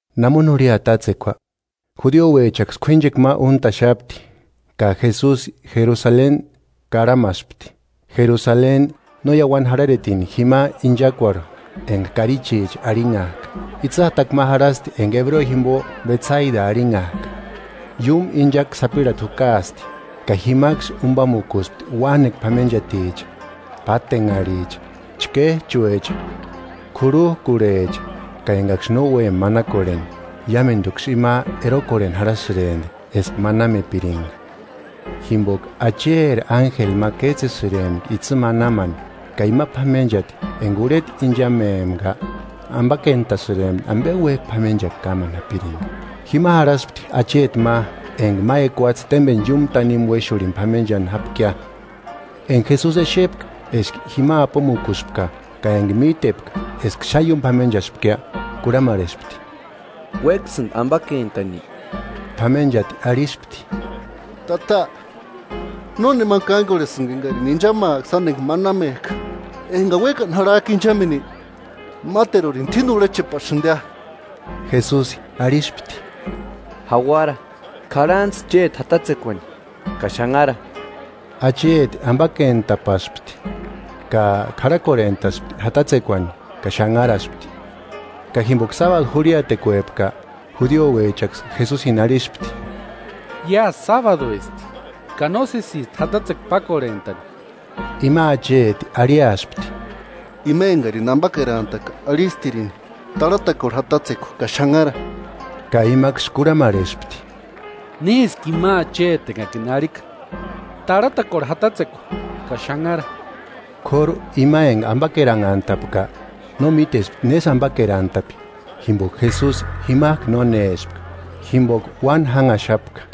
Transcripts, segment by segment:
Namoni jurhia tátsekua, judiouechaksï k'uínchekua ma úntaxapti, ka Jesusi Jerusaleni karhamaspti. Jerusaleni, no iauani jarharetini jima inchakuarhu enga Karichicha arhinhajka, itsï jatakua ma jarhasti enga ebreo jimbo Betsata arhinhajka. Iúmu inchakua sapirhati jukaasti, ka jimaksï umbamukuspti uánekua p'amenchaticha, pátenharhicha, chkéjchuecha, k'urhujkurhecha (ka engaksï no úempka manakorheni. Iámenduksï ima erokorheni jarhasïremti eska manamepiringa, jimboka Acheri ánjeli ma kétsesïrempka itsï manamani ka ima p'amenchati enga urheta inchamempka ambakentasïrempti ambe uéjki p'amenchakua kámani japiringa.) Jima jarhaspti acheti ma enga ma ekuatse témbeni iúmu tanimu uéxurhini p'amenchani jápkia. Enga Jesusi exepka eska jima apomukuspka ka enga mítepka eska xáni ióni p'amenchaspkia, kurhamarhespti: –¿Uéksïndi ambakentani? P'amenchati arhispti: –Tata, nónemani kángorhesïnga engarini inchamaaka sáni enga manamejka. Engani uékani jarhajka inchameni máterurini t'uíni urhechepasïndia. Jesusi arhispti: –Jauara, k'arhantsï chéti jatatsekuani ka xanhara. Acheti ambakentapaspti, ka k'arhakorhentaspti jatatsekuani ka xanharaspti. Ka jimboka sábadu jurhiatekuepka, judiouechaksï Jesusini arhispti: –Iásï sábaduesti; ka nósesisti jatatsekua pákorhentani. Ima acheti arhiaspti: –Ima engarini ambakerantaka arhistirini: Tarhatakorhe jatatsekua ka xanhara. Ka imaksï kurhamarhespti: –¿Néski ima acheti engakini arhika: Tarhatakorhe jatatsekua ka xanhara? K'óru ima enga ambakeranhantapka no mítespti nésï ambakerantapi, jimboka Jesusi jimajku nónespka jimboka uáni jánhaxapka.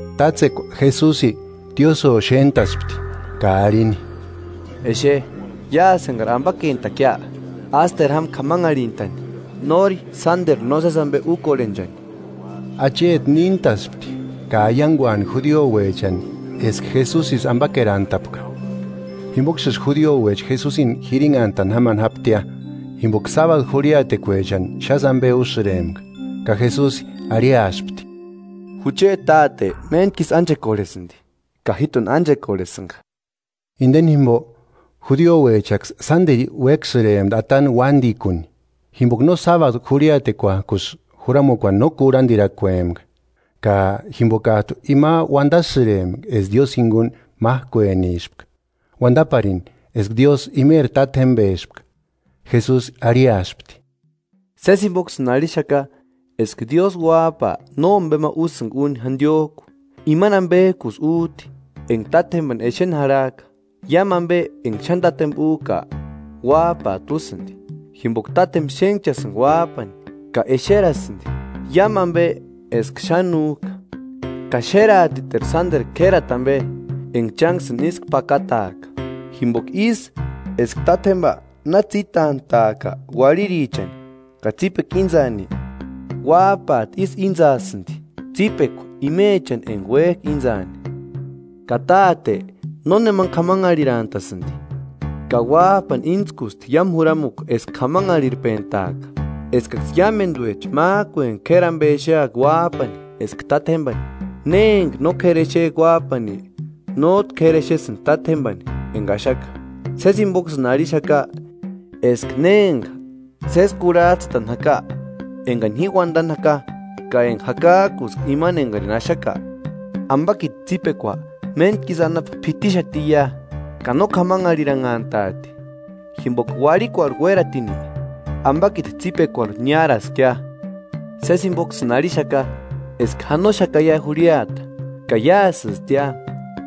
Tátsekua Jesusi tiósïo xéntaspti, ka arhini: –Exe, iásï engari ambakentakia, ásteru jáma kámanharhintani, nóri sánderu nósesi ambe úkorhenchani. Acheti níntaspti ka aianguani judiouechani eska Jesusisï ambakerantapka. Jimboksïsï judiouecha Jesusini jirinhantani jámani jáptia, jimboka sábadu jurhiatekuechani xásï ambe úsïrempka. Ka Jesusi arhiaspti: –Jucheti Táte méntku isï ánchekorhesïndi, ka jíjtuni ánchekorhesïnga. Indeni jimbo, judiouechaksï sánderu uéksïrempti atani uándikuni, jimboka no sábadu jurhiatekuankusï juramukuani no kurhandirakuempka, ka jimbokajtu ima uandasïrempka eska Diósï jinguni májkuenispka, uandaparini eska Diósï imeri Tátjembespka. Jesusi arhiaspti: “Sési jimboksïni arhixaka eska Diósï Uájpa nómbema úsïnga úni jandiojku; imani ambejkusï újti enga Tátjembani exeni jarhajka. Iámu ambe enga xáni Tátjemba újka, Uájpajtu úsïndi. Jimboka Tátjemba xénhchasïnga Uájpani ka exerasïndi iámu ambe eska xáni újka; ka xéraatiteru sánderu k'érati ambe, enga chánksïni ísku pakataaka. Jimboka ísï eska Tátjemba na tsítantaajka uarhirichani ka tsípekua íntsaani, Uájpajtu ísï íntsaasïndi tsípekua imechani enga uéjka intsaani. Ka Táte nónemani k'amanharhirantasïndi, ka Uájpani íntskusti iámu juramukua eska k'amanharhirpentaaka, eskaksï iámenduecha májkueni k'éri ambe exeaka Uájpani eska Tátjembani. Ne enga no k'éri exejka Uájpani, nójtu k'éri exesïndi Tátjembani enga axaka.” “Sési jimboksïni arhixaka eska ne enga sési kurhajtsïtani jaka engani ji uandani jaka ka enga jakajkuska imani engarini axaka, ambakiti tsípekua méntku isï anapu p'itixatiia; ka no k'amanharhiranhantaati, jimboka uarhikuarhu uératini ambakiti tsípekuarhu niáraskia. Sési jimboksïni arhixaka eska janoxakaia jurhiata, ka iásïstia,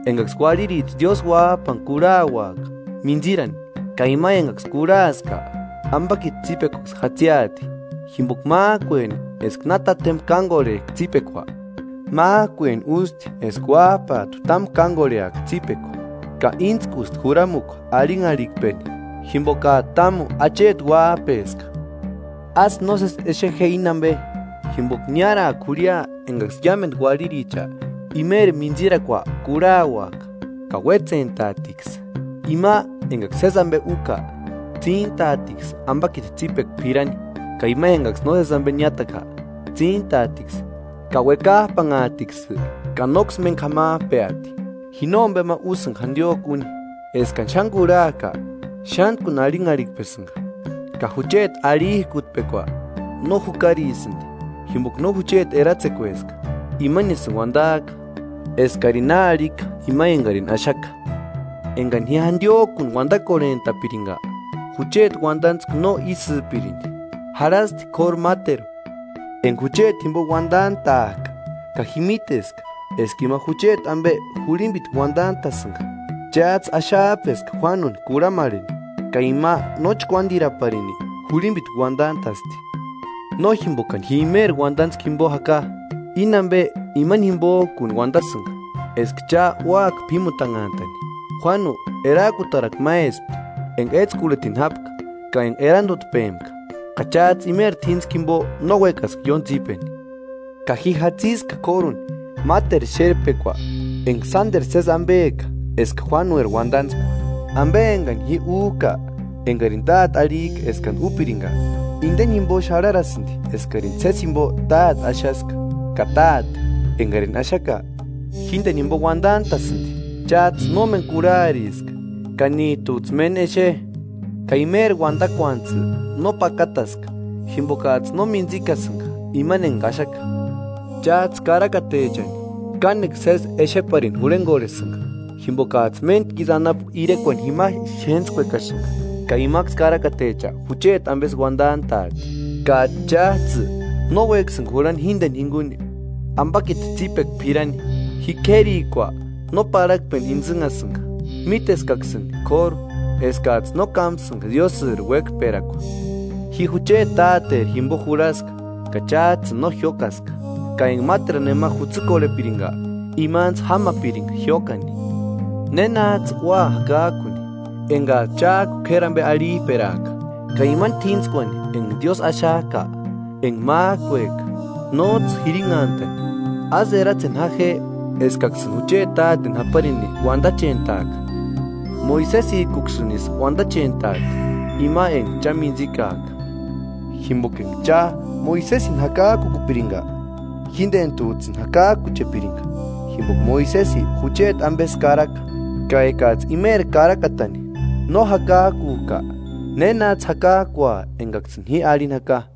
engaksï uarhiricha Diósï Uájpani kurhauaka mintsïrani; ka ima engaksï kurhaska, ambakiti tsípekuaksï jatsiati, jimboka májkueni eska na Tátjemba kángorhejka tsípekua, májkueni ústi eska Uájpajtu támu kángorheaka tsípekua ka íntskusti juramukua arhinharhikpeni, jimbokajtu támu acheti Uájpeska. Ásï nósesi exe je íni ambe, jimboka niáraaka jurhia engaksï iámendu uarhiricha imeri mintsirakua kurhauaka ka uétsentaatiksï. Ima engaksï sési ambe úka, tsíntaatiksï ambakiti tsípekua p'irani; ka ima engaksï nósesi ambe niátaka, tsíntaatiksï ka uekajpanhaatiksï ka nóksï méni k'amajpeati.” “Ji nómbema úsïnga jandiojkuni úni. Eskani xáni kurhajka, xántkuni arhinharhikpesïnga, ka jucheti arhijkutpekua no jukarisïndi, jimboka no jucheti eratsekueska, imanisïni uandajka eskarini na arhika ima engarini axaka. Ekani ji jandiojkuni uandakorhentapiringa, jucheti uandantskua no ísïpirindi. Jarhasti k'óru máteru enga jucheti jimbo uandantajka, ka ji míteska eska ima jucheti ambe jurhimbitku uandantasïnga. Chájtsï axajpeska Juánuni kurhamarheni, ka ima no chkuándiraparini jurhimbitku uandantasti. No jimbokani ji nemeri uandantskua jimbo jaka, íni ambe imani jimbojkuni uandasïnga, eska cha úaka p'ímutanhantani. Juánu erajkutarakua máespti enga étskurhitini jápka ka enga erandutpempka, ka chájtsï imeri t'íntskua jimbo no uékaska ióni tsípeni. Ka ji jatsiska k'óruni máteru xérpekua enga sánderu sési ambeka eska Juánueri uandantskua. Ambe engani ji újka, engarini Táte arhijka eskani úpiringa, inde jimbo xarharasïndi eskarini sési jimbo Táte axaska. Ka Táte, engarini axaka, jíndeni jimbo uandantasïndi. Chájtsï nómeni kurhariska ka níjtujtsï méni exe, ka imeri uandakuantsï no pakataska, jimbokajtsï no mintsïkasïnga imani enga axaka. Chájtsï karakatechani kánekua sési exeparini jurhengorhesïnga, jimbokajtsï méntku isï anapu irekuani jima xéntskuekasïnga; ka imaksï karakatecha jucheti ambesï uandantajti. Ka chájtsï no uéksïnga jurhani jíndeni jinguni ambakiti tsípekua p'irani.” “Ji k'érikua no parhakpeni intsïnhasïnga. Míteskaksïni k'óru eskajtsï no kámasïnga Diósïri uékperakua. Ji jucheti Táteri jimbo jurhaska, ka chájtsïni no jiókaska; ka enga máteru nema jutsïkorhepiringa imantsï jámapiringia jiókani. ¿Nénajtsï ua jakajkuni, engajtsï chájku k'éri ambe arhijperajka, ka imani t'íntskuani enga Diósï axajka, enga májkueka, nójtsï jirinhantani? Ásï eratseni ja je eskaksïni jucheti Táteni japarini uandachentaaka; Moisesijkuksïnisï uandachentajti, ima enga cha mintsikajka. Jimboka enga cha Moisesini jakajkukupiringa, jíndenijtujtsïni jakajkuchepiringa, jimboka Moisesi jucheti ambesï karaka. Ka ekajtsï imeri karakatani no jakajkujka ¿Nénajtsï jakajkua engaksïni ji arhini jaka?”